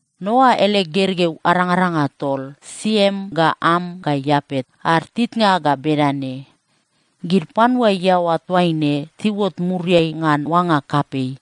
Noa ele gergeu arangaranga tol, Siem ga Am ga Iapet, ad titnga ga bedane. Gid panua iaoa toaine tiuot muriai ngan oanga kapei.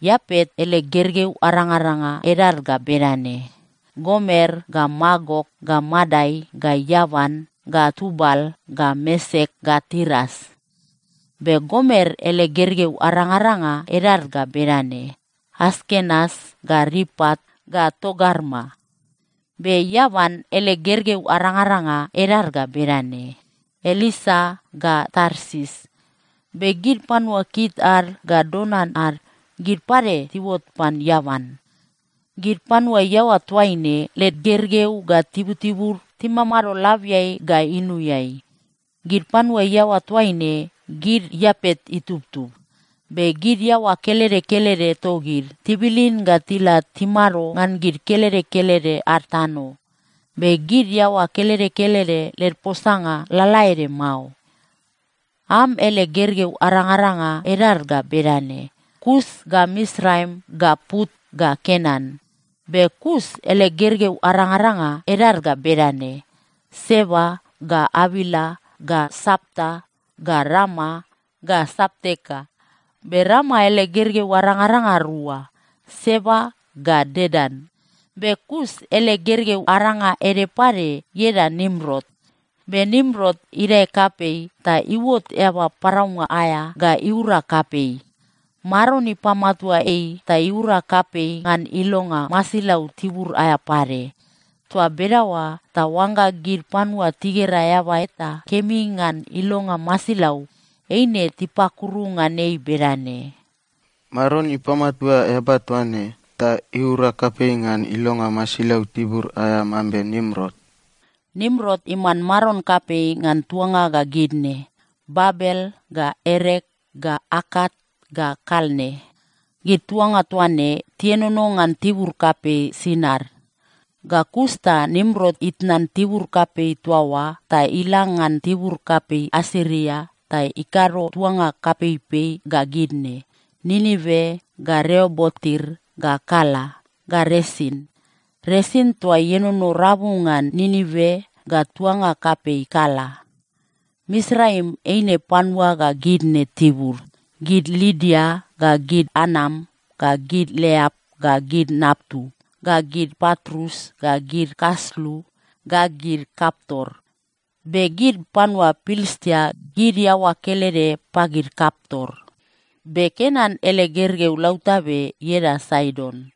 Iapet ele gergeu arangaranga edad ga bedane: Gomer ga Magok ga Madai ga Iavan ga Tubal ga Mesek ga Tiras. Be Gomer ele gergeu arangaranga edad ga bedane: Askenas ga Ripat ga Togarma. Be Iavan ele gergeu arangaranga edad ga bedane: Elisa ga Tarsis. Be gid panua Kit ad ga Dodan ad, gid pade tiuot pan Iavan. Gid panua iaoa toaine, led gergeu ga tibutibud timamado labiai ga inuiai. Gid panua iaoa toaine, gid Iapet itubtub. Be gid iaoa kelede kelede togid, tibilin ga tila timado ngan gid kelede kelede ad tano. Be gid iaoa kelede kelede led posanga lalaede mao. Am ele gergeu arangaranga edad ga bedane: Kus ga Misraim ga Put ga Kenan. Be Kus ele gergeu arangaranga edad ga bedane: Seba ga Avila ga Sapta ga Rama ga Sapteka. Be Rama ele gergeu arangaranga rua: Seba ga Dedan. Be Kus ele gergeu aranga ede pade ieda Nimrot. Be Nimrot idae kapei ta iuot eaba paraunga aea ga iura kapei. Maron ipamatua ei ta iura kapei ngan ilonga masilau tibur aea pade. Toa bedaoa ta oangga gid panua tigera eaba eta kemi ngan ilonga masilau, eine tipakuru ngan ei bedane, “Maron ipamatua eaba toa ne ta iura kapei ngan ilonga masilau tibur aea mambe Nimrot.” Nimrot iman maron kapei ngan tuanga ga gid ne: Babel ga Erek ga Akat ga Kalne. Gid tuanga toa ne tienono ngan tibur kapei Sinar. Ga kus ta Nimrot itnan tibur kapei toa oa ta ila ngan tibur kapei Asiria ta ikado tuanga kapeipei ga gid ne: Ninive ga Reobotir ga Kala ga Resin. Resin toa ienono rabu ngan Ninive ga tuanga kapei Kala. Misraim eine panua ga gid ne tibud: gid Lidia ga gid Anam ga gid Leap ga gid Naptu ga gid Patrus ga gid Kaslu ga gid Kaptor. Be gid panua Pilistia, gid iaoa kelede pagid Kaptor. Be Kenan ele gergeu lautabe ieda Saidon.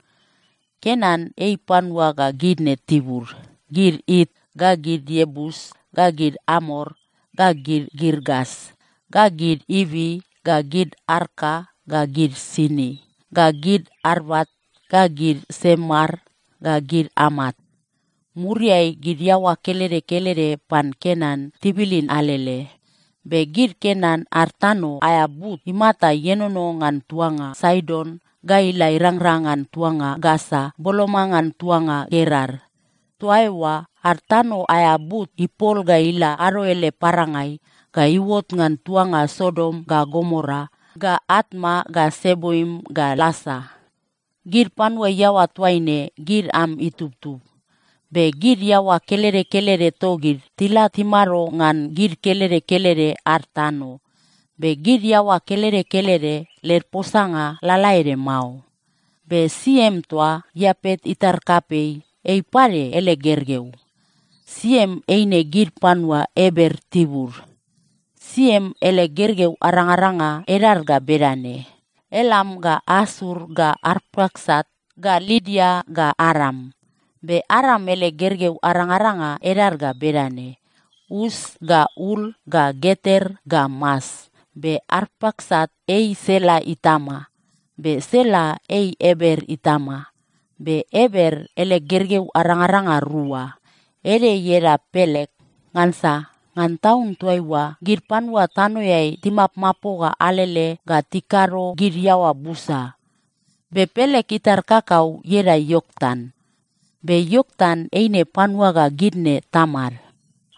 Kenan ei panua ga gid ne tibud: gid It ga gid Iebus ga gid Amor ga gid Girgas ga gid Ivi ga gid Arka ga gid Sini ga gid Arvat ga gid Semar ga gid Amat. Muriai gid iaoa kelede kelede pan Kenan tibilin alele. Be gid Kenan ad tano aea but imata ienono ngan tuanga Saidon ga ila irangrang ngan tuanga Gasa boloma ngan tuanga Gerar. Toa eoa ad tano aea but ipol ga ila ado ele parangai ga iuot ngan tuanga Sodom ga Gomora ga Atma ga Seboim ga Lasa. Gid panua iaoa toaine, gid Am itubtub. Be gid iaoa kelede kelede togid, tila timado ngan gid kelede kelede ad tano. Be gid iaoa kelede kelede led posanga lalaede mao. Be Siem toa, Iapet itar kapei, ei pade ele gergeu. Siem eine gid panua Eber tibud. Siem ele gergeu arangaranga edad ga bedane: Elam ga Asur ga Arpaksat ga Lidia ga Aram. Be Aram ele gergeu arangaranga edad ga bedane: Us ga Ul ga Geter ga Mas. Be Arpaksat ei Sela itama, be Sela ei Eber itama. Be Eber ele gergeu arangaranga rua. Ede ieda Pelek. Ngansa ngan taun toaiua gid panua tanoeai timapmapoga alele ga tikado gid iaoa busa. Be Pelek itar kakau ieda Ioktan. Be Ioktan eine panua ga gid ne tamad: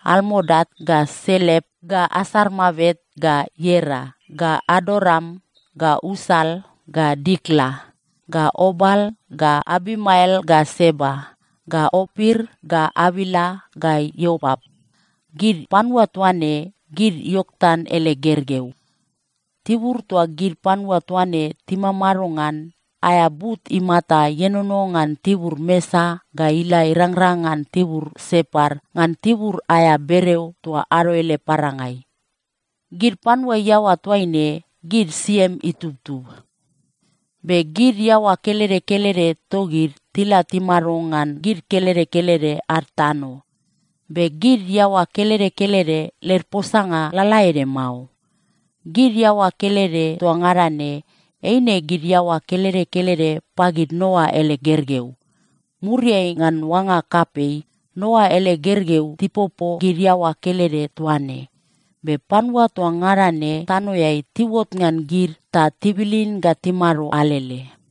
Almodat ga Selep ga Asarmavet ga Iera ga Adoram ga Usal ga Dikla ga Obal ga Abimael ga Seba ga Opir ga Avila ga Iobap. Gid panua toa ne, gid Ioktan ele gergeu. Tibur toa gid panua toa ne timamado ngan, aea but imata ienono ngan tibur Mesa ga ila irangrang ngan tibur Separ ngan tibur aea bereo toa ado ele parangai. Gid panua iaoa toaine, gid Siem itubtub. Be gid iaoa kelede kelede togid tila timado ngan gid kelede kelede ad tano. Be gid iaoa kelede kelede led posanga lalaede mao. Gid iaoa kelede toa ngada ne, eine gid iaoa kelede kelede pagid Noa ele gergeu. Muriai ngan oanga kapei, Noa ele gergeu tipopo gid iaoa kelede toa ne, be panua toa ngada ne tanoeai tiuot ngan gid ta tibilin ga timado alele.